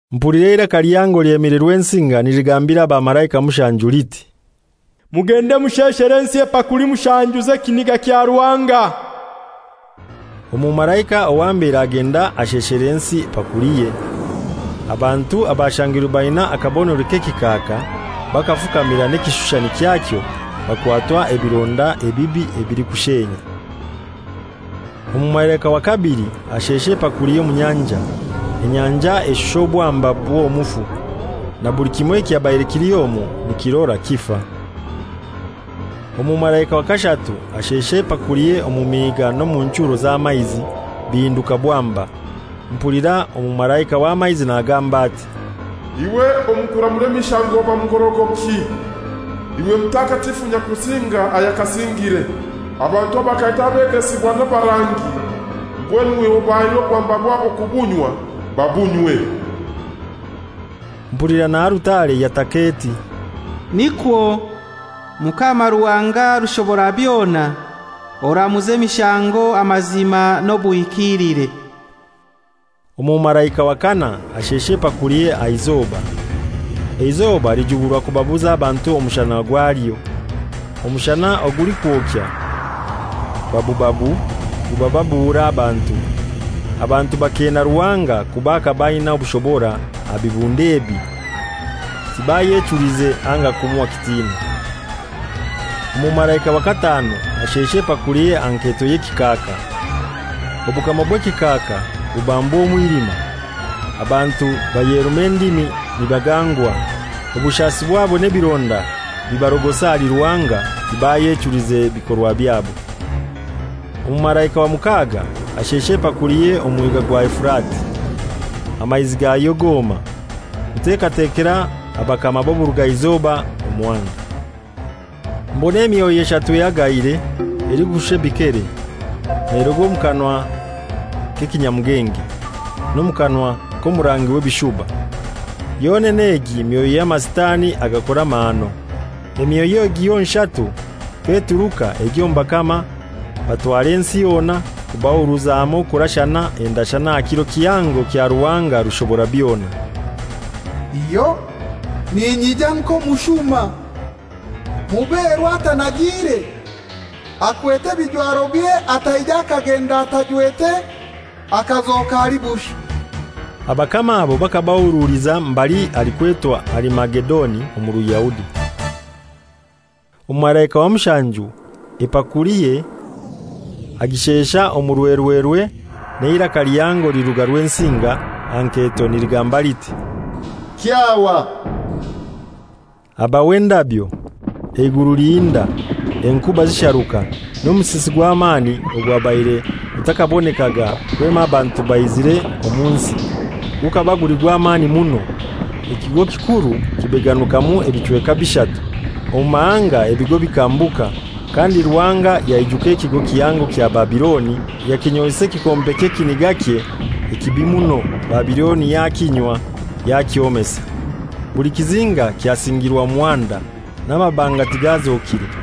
Mpulira eiraka lihango lyemire Rwensinga niligambira abamalaika mushanju liti, «Mugende musheshere ensi epakuli mushanju z'ekiniga kya Ruhanga.» Omumalaika owa mbere agenda asheshera ensi epakuliye. Abantu abashangirwe baina akabonero k'ekikaaka bakafukamira n'ekishushani kyakyo bakwatwa ebironda ebibi ebilikushenya. Omumalaika wa kabili ashesha epakuliye omu nyanja. Enyanja eshusha obwamba bw'omufu, na buli kimoi ekyabaire kili omwo nikirora kifa. Omumalaika wa kashatu ashesha epakuliye omu miiga n'omu nchuro z'amaizi, bihinduka bwamba. Mpulira omumalaika w'amaizi nagamba ati, «Iwe omu kuramura emishango oba mugorogoki, iwe Omutakatifu Nyakusinga ayakasingire. Abantu bakaita abegesibwa n'abarangi, mbwenu iwe obahaire obwamba bwabo kubunywa. Babunywe!» Mpulira na alutare yataka eti, «Nikwo, Mukama Ruhanga Rushoborabyona, oramuza emishango amazima n'obuhikiilire!» Omumalaika wa kanai ashesha epakuliye aha izoba. Eizoba lijuburwa kubabuza abantu omushana gwalyo. Omushana ogulikwokya babubabu gubabuura abantu, abantu bakeena Ruhanga kuba akaba aina obushobora aha bibundo ebi, tibayechulize anga kumuha kitinwa. Omumalaika wa kataanu ashesha epakuliye aha nketo y'ekikaaka. Obukama bw'ekikaaka bubambwa omwilima; abantu bayeruma endimi nibagangwa; obushasi bwabo n'ebironda bibarogosa ahali Ruhanga, tibayechulize bikorwa byabo. Omumalaika wa mukaaga ashesha epakuliye omu Mwiga gwa Efurati, amaizi gayo goma, kutekatekera abakama b'oburugaizoba omuhanda. Mbona emyoyo eshatu ehagaire elikushusha ebikere, neruga omu kanwa k'ekinyamugenge, n'omu kanwa k'omurangi, w'ebishuba. Yonene egi myoyo y'amasitani agakora amahano. Emyoyo egi yonshatu k'eturuka egya omu bakama batwara ensi yona kubahuruza hamoi kurashana endeshana aha kiro kihango kya Ruhanga Rushoborabyona. («Iyo, ninyija nk'omushuma! Muberwa atanagiire, akwete ebijwarobye ataija akagenda atajwete akazoka ali bushai!») Abakama abo bakabahuruliza mbali halikwetwa Arimagedoni omu Ruyahudi. Omumalaika wa mushanju ebakuliye agishesha omu, rwerwerwe n'eiraka lihango liruga Rwensinga, aha nketo, niligamba liti, «Kyahwa!» Habaho endabyo, eiguru lihinda, enkuba zisharuka, n'omusisi gw'amani ogwabaire gutakabonekaga kwema abantu baizire omu nsi, gukaba guli gw'amani muno. Ekigo kikuru kibeganukamu ebichweka bishatu, omu mahanga ebigo bikambuka, kandi Ruhanga yaijuka ekigo kihango kya Babiloni, yakinyoisa ekikompe ky'ekinigakye ekibi muno, Babiloni yakinywa yakyomesa. Buli kizinga kyasingirwa muhanda, n'amabanga tigazokire.